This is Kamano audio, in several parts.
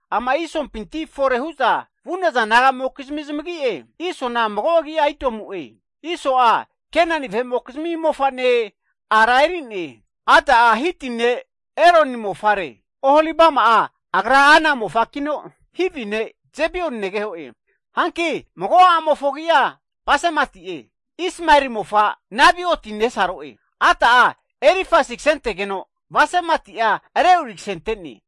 Ama'i Isompinti fore hu'za vu'naza naga'mokizmi zamagi'e, Isona mago agi'a Idomu'e. Iso'a Kenani vahe'mokizmi mofane ara eri'ne, Ada'a Hiti ne Eloni mofare. Oholibama'a, agra Ana mofakino Hivi ne' Zibeoni negeho'e. Hanki mago a'mofo agi'a Basemati'e, Ismaeli mofa, Nebaioti nesaro'e. Ada'a Elifazi kasentegeno, Basemati'a Reueli kase ante'ne,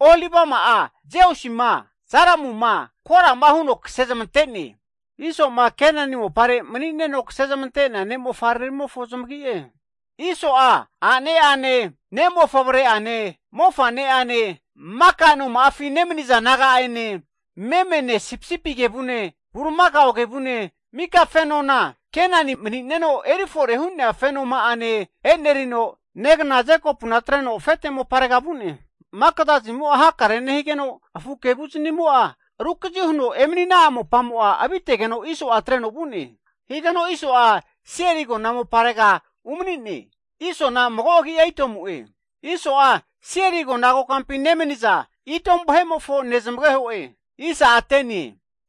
Oholibama'a Jeusima, Jalamuma, Korama huno kase zamante'ne. Iso'ma Kenani mopare mani'neno kasezmante'nea ne'mofavreramimofo zamagi'e. Iso'a a'neane, ne'mofavre ane, mofa'neane, maka noma'afi nemaniza naga'ane, memene, sipisipi kevune, bulimakao kevune, mika fenona Kenani mani'neno erifore hu'nea fenoma'ane enerino, negna Jekopuna atreno afete moparega vu'ne. Maka zazanimo'a hakare nehigeno, afu kevu zinimo'a rukazi huno emanina'a mopamo'a avitegeno, Iso'a atreno vu'ne. Higeno Iso'a Seiri agona moparega umani'ne. Isona mago agi'a Idomu'e. Iso'a Seiri agona kokampi nemaniza Idomu vahe'mofo nezmageho'e.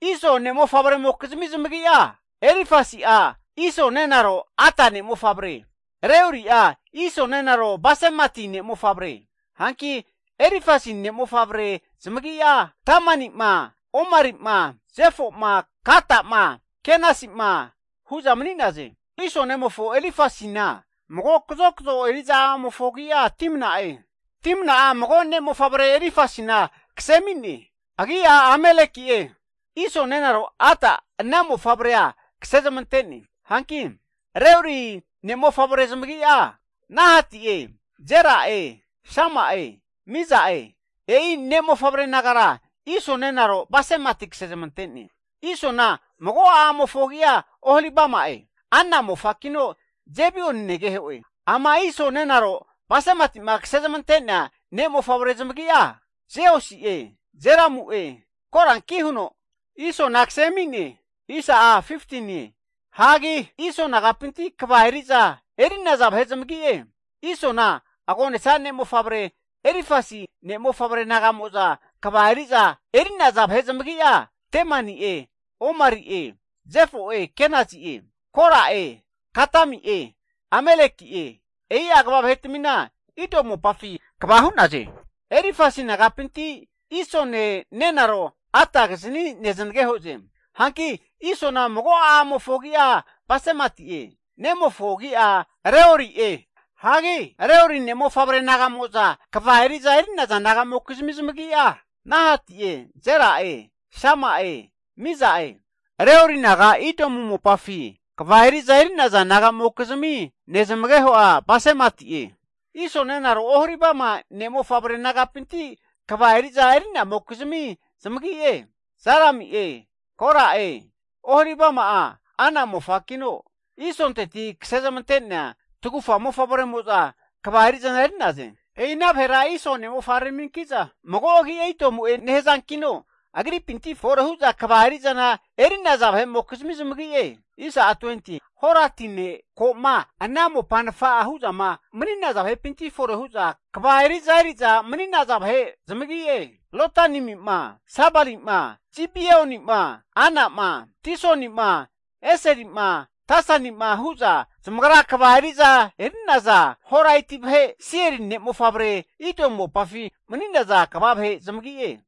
Iso ne'mofavremokizmi zamagi'a, Elifazi'a Iso nenaro Ada ne'mofavre, Reueli'a Iso nenaro Basemati ne'mofavre. Hanki Elifazi ne'mofavre zamagi'a Temani'ma, Omari'ma, Zefo'ma, Gata'ma, Kenasi'ma hu'za mani'naze. Iso nemofo Elifazina, mago kazokzo eri'za a'amofo agi'a Timna'e. Timna'a mago ne'mofavre Elifazina kase ami'ne, agi'a Amaleki'e. Iso nenaro Ada ana ne'mofavrea kase zamante'ne. Hanki Reueli ne'mofavre zamagi'a, Nahati'e, Zera'e, Sama'e, Miza'e. E'i ne'mofavre nagara, Iso nenaro Basemati kase zamante'ne. Isona mago a'amofo agi'a Oholibama'e. Ana mofakino Zibeon negeho'e. Ama Iso nenaro Basemati'ma kase zamante'nea ne'mofavre zamagi'a, Jeusi'e, Jalamu'e, Koranki huno Isona kase ami'ne. Hagi Iso nagapinti kva eri'za eri'naza vahe zamagi'e. Isona agonesa ne'mofavre Elifasi ne' mofavre naga'mo'za kva eri'za eri'naza vahe zamagi'a Temani'e, Omari'e, Zefo'e, Kenazi'e, Kora'e, Gatami'e, Amaleki'e. E'i'a kva vahe'tmina Idomu mopafi kegava hu'naze. Elifasi nagapinti, Isone nenaro Adakizni zanagehoze. Hanki Isona mago a'amofo agi'a Basemati'e, nemofo agi'a Reuelie. Hagi Reueli ne' mofavre nagamoza kva eri'za eri'naza naga'mokizmi zamagi'a, Nahati'e, Zera'e, Sama'e, Miza'e. Reueli naga Idomu mopafi kva eri'za eri'naza naga'mokizmi nezmageho'a Basemati'e. Iso nenaro Oholibama ne' mofavre nagapinti kva eriza eri'namokizmi zamagi'e, Jalami'e, Kora'e. Oholibama'a Ana mofakino, Isonteti kase zamante'nea tagufa mofavremo'za kva eri'zana eri'naze. E'ina vahera Iso ne'mofavreraminki'za mago agi'a Idomu'e nehazankino agripinti fore hu'za kva eri'zana eri'naza vahe'mokizmi zamagi'e. Ama Seiri ne'mofavre Horati ne' ko'ma ana mopa nafa'a hu'zama mani'naza vahepinti fore hu'za kva eri'za eri'za mani'naza vahe zamagi'e, Lotani'ma, Sobali'ma, Zibeoni'ma, Ana'ma, Disoni'ma, Eseli'ma, Disani'ma hu'za zamagra kva eri'za eri'naza Horaet' vahe, Seiri ne' mofavre Idomu mopafi mani'naza kva vahe zamagi'e.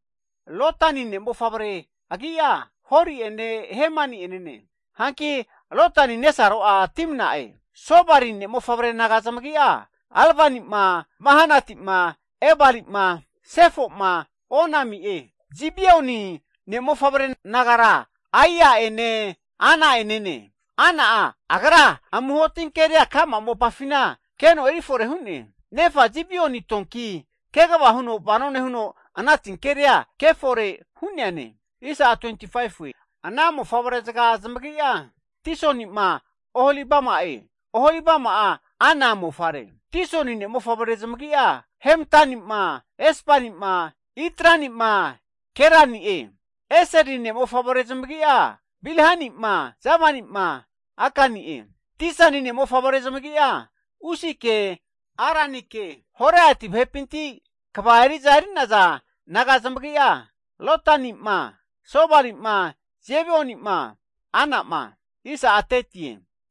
Lotani ne'mofavre agi'a Hori ene, Hemani'enene. Hanki Lotani nesaro'a Timna'e. Sobali ne'mofavre naga zamagi'a Alvani'ma, Manahati'ma, Ebali'ma, Sefo'ma, Onami'e. Zibeoni ne'mofavre nagara, Aia'ene, Ana'enene. Ana'a agra amuho tinkeria ka'ma mopafina keno eri fore hu'ne. Nefa Zibeoni donki kegava huno vano nehuno ana tinkeria ke fore hu'neane. Ana mofavrezaga zamagi'a, Disoni'ma, Oholibama'e. Oholibama'a, Ana mofare. Disoni ne'mofavre zamagi'a Hemdani'ma, Esbani'ma, Itrani'ma Kerani'e. Eseli ne'mofavre zamagi'a Bilhani'ma, Zavani'ma, Akani'e. Disani ne'mofavre zamagi'a Usike, Aranike. Horaeti vahepi kva eri'za eri'naza naga zamagi'a, Lotani'ma, Sobali'ma, Zibeoni'ma, Ana'ma,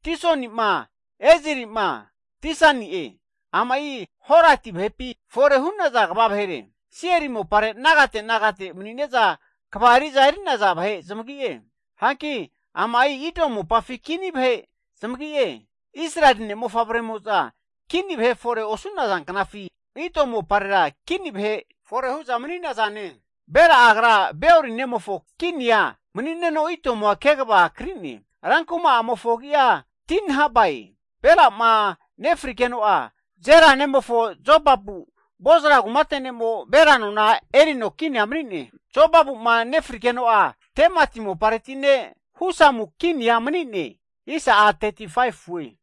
Disoni'ma, Ezeri'ma, Disani'e. Ama'i Horati vahepi fore hu'naza kva vahere. Seiri mopare nagate nofite hu'za mani'neza kva eri'za eri'naza vahe zamagi'e. Hanki ama'i Idomu mopafi kini vahe zamagi'e, Israeli ne' mofavre'mo'za kini vahe fore osu'naza knafi, Idomu moparera kini vahe fore hu'za mani'nazane. Bela'a agra Beori nemofo kinia manino Idomua kegava kri'ne, rankuma'amofo agi'a Dinhabae. Bela'ma nefrigeno'a, Zera nemofo Jobabu, Bozra kumate ne'mo Bela nona erino kinia mani'ne. Jobabu'ma nefrigeno'a, Temati mopareti ne' Husamu kinia mani'ne.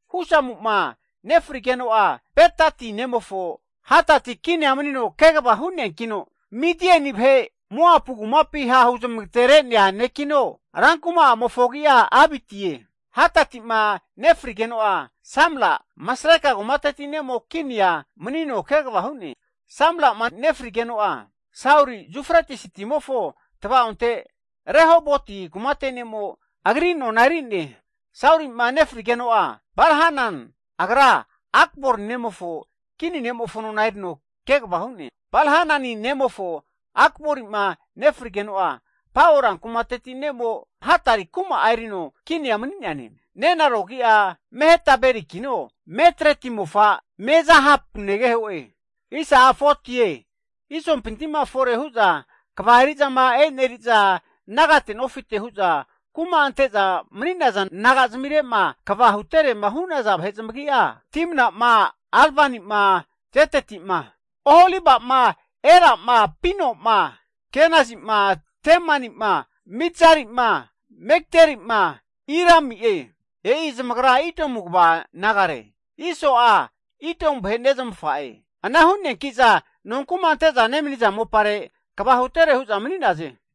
Husamu'ma nefrigeno'a Bedati nemofo Hadadi kinia manino kegava hu'neankino, Midian vahe Moapu kumapi ha' huzamagatere'nea nekino, rankuma'amofo agi'a Avitie. Hadadi'ma nefrigeno'a Samla, Masreka kumateti ne'mo, kinia manino kegava hu'ne. Samla'ma nefrigeno'a Sauli, Yufretis timofo tva'onte Rehoboti kumate ne'mo agri nona eri'ne. Sauli'ma nefrigeno'a Bal-hanan Akbor nemofo kinimofo nona erino kegava hu'ne. Bal-hanani nemofo Akbori'ma nefrigeno'a, Pao rankumateti ne'mo Hadari kuma'a erino kini mani'neane, Nenaro agi'a Mehetabelikino, Matreti mofa Mezahab negeho'e. Isompinti'ma fore hu'za kva eri'zama eneri'za nagate nofite'ma hu'za kuma ante'za mani'naza naga'zmire'ma kva huterema hu'naza vahe zamagi'a, Timna'ma, Alvani'ma, Jeteti'ma, Oholiba'ma, Ela'ma, Pino'ma, Kenazi'ma, Temani'ma, Mibzari'ma, Megdili'ma, Irami'e. E'i zamagra Idomu kva nagare, Iso'a Idomu vahe nezmafa'e. Ana hu'neanki'za nonku'ma ante'za nemani'za mopare kva hutere hu'za mani'naze.